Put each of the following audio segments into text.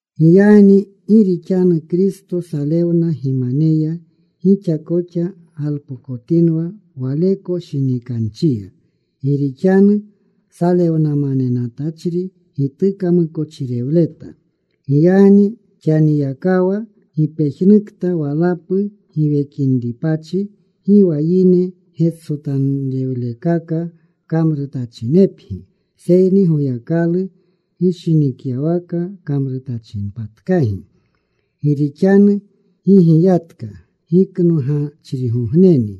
Giyagni gi rixanu Kristo salewna gimaneya, gixa koxa galpokotinwa waleko shinikanchiya. Gi rixanu salewnamanetachri gituka mukochirewleta. Giyagni xaniyakawa gipejnukta walapu giwekinripachi, gi wa yine getsotanrewlekaka kamrutachinepgi, seyni Goyakalu gishinikyawaka kamrutachinepatkagi. Gi rixanu gigiyatka giknogachrigogneni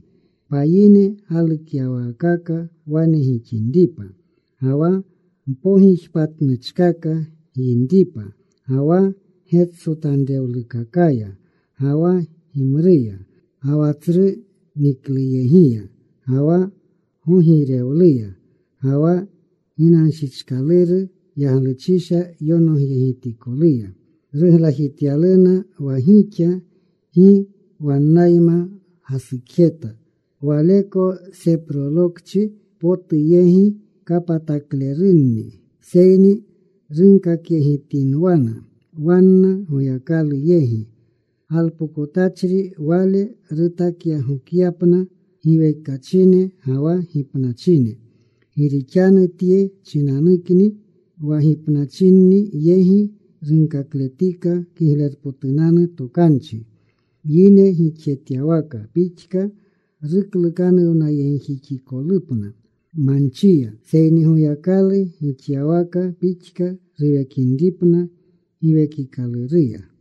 payine galukyawaakaka wane gixinripa, ga wa mpogijpatnuchkaka gyinripa, ga wa getsotanrewlukakaya, ga wa gimruya, ga wa tsru nikluyegiya, ga wa gogiirewluya, ga wa ginanshichkaluru yagluchisha yonogyegitikoluya. Ruglajityaluna wa gixa gi wannayma gasukjeta waleko seprolokchi potu yegi. Kapataklerunni. Seyni runkakyegitinwana wanna Goyakalu yegi. Galpokotachri Wale rutakyagokyapna giwekachine ga wa gipnachine. Gi rixanu tye chinanukni wa gipnachinni yegi runkakletika Kiglerpotunanu Tokanchi. Yine gixjetyawaka pixka ruklukanuwnayegjixikolupna manchiya, seyni Goyakalu gixyawaka pixka ruwekinripna Giwekikaluruya.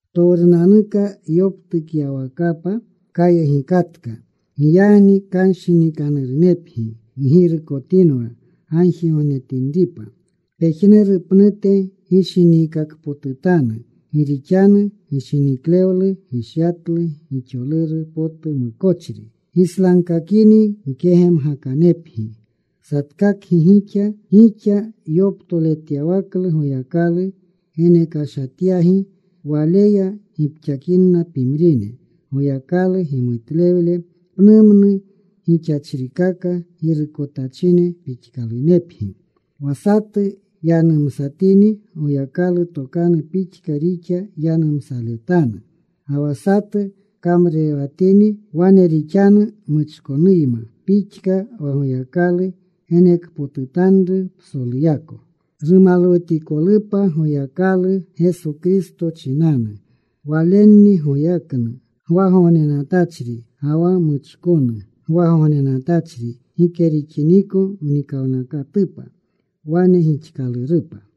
Ptowrunanuka yoptukyawakapa kayegikatka. Giyagni kanshinikanurunepgi. Ggirukotinwa gagjigognetinripa. Pejnuru pnute gishiniikakpotutanu. Gi rixanu gishiniklewlu gishyatlu gixoluru potu mukochri. Gislagkakini mkegemgakanepgi. Satkakgi gixa gixa yoptoletyawaklu Goyakalu genekashatyagi, waleya gipxakinna pimrine. Goyakalu gimutlewle pnumnu gixachrikaka girukotachine pixkalunepgi. Wa satu yanumsatini, Goyakalu tokanu pixka rixa yanumsaletanu. Ga wa satu kamrurewatini, wane rixanu muchkonuyma pixka wa Goyakalu genekpotutanru. Psoluyako rumalwutikolupa Goyakalu, Geso Kristo chinanu. Walenni goyaknu gwagognenatachri ga wa muchkonu gwagognenatachri gike rixiniko mnikawnakatupa. Wane gixkalurupa.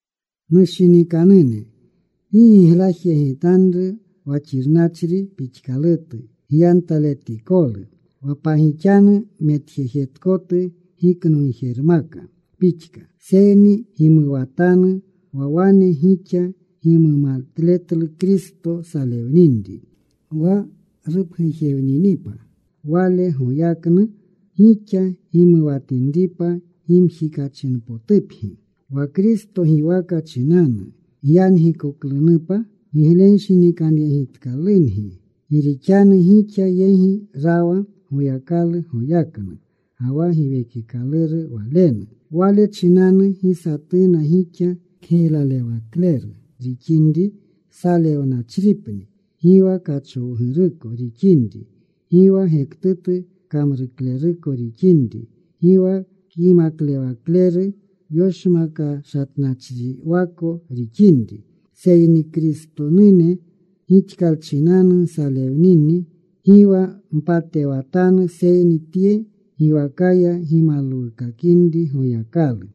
Nushinikanune, gi giglajyegitanru wa xirnachri pixkalutu gyantaletikolu, wa pagixanu metjejetkotu giknogjermaka pixka. Seyni gimuwatanu wa wane gixa gimumatletlu Kristo salewninri. Wa rupgujewninipa Wale goyaknu, gixa gimuwatinripa gimjikachinpotupgi. Wa Kristo giwaka chinanu gyangikoklunupa giglenshinikanyegitkalungi. Gi rixanu gixa yegi rawa Goyakalu goyaknu ga wa Giwekikaluru Walenu. Wale chinanu gi satuna gixa kgiylalewakleru rixinri salewnachripni, gi wa kachowguruko rixinri, gi wa gektutu kamrukleruko rixinri, gi wa kyimaklewakleru yoshmakashatnachriwako rixinri. Seyni Kristonune gixkalchinanu nsalewnini, gi wa mpatewatanu, seyni tye giwakaya gimalwukakinri Goyakalu.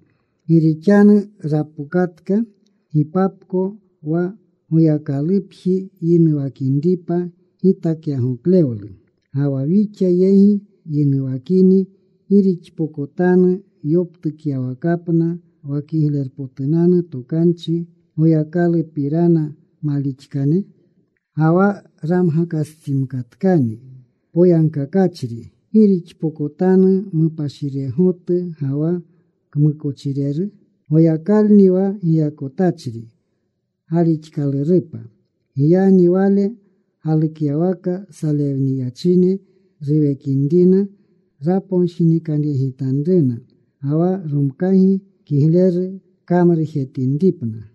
Gi rixanu rapokatka gipapko wa Goyakalupjiya yinuwakinripa gitakyagoklewlu. Ga wa wixa yegi yinuwakini ¿gi rixpokotanu yoptukyawakapna wa Kiglerpotunanu Tokanchi Goyakalupirana malixaklene? Ga wa ramgakastsimkatkani poyagkakachri ¿gi rixpokotanu mupashiregotu ga wa kmukochireru? Goyakalni wa giyakotachri galixkalurupa. Giyagni Wale galukyawaka salewniyachine ruwekinrina raponshinikanyegitanruna, ga wa romkagi kigleru kamrujetinripna.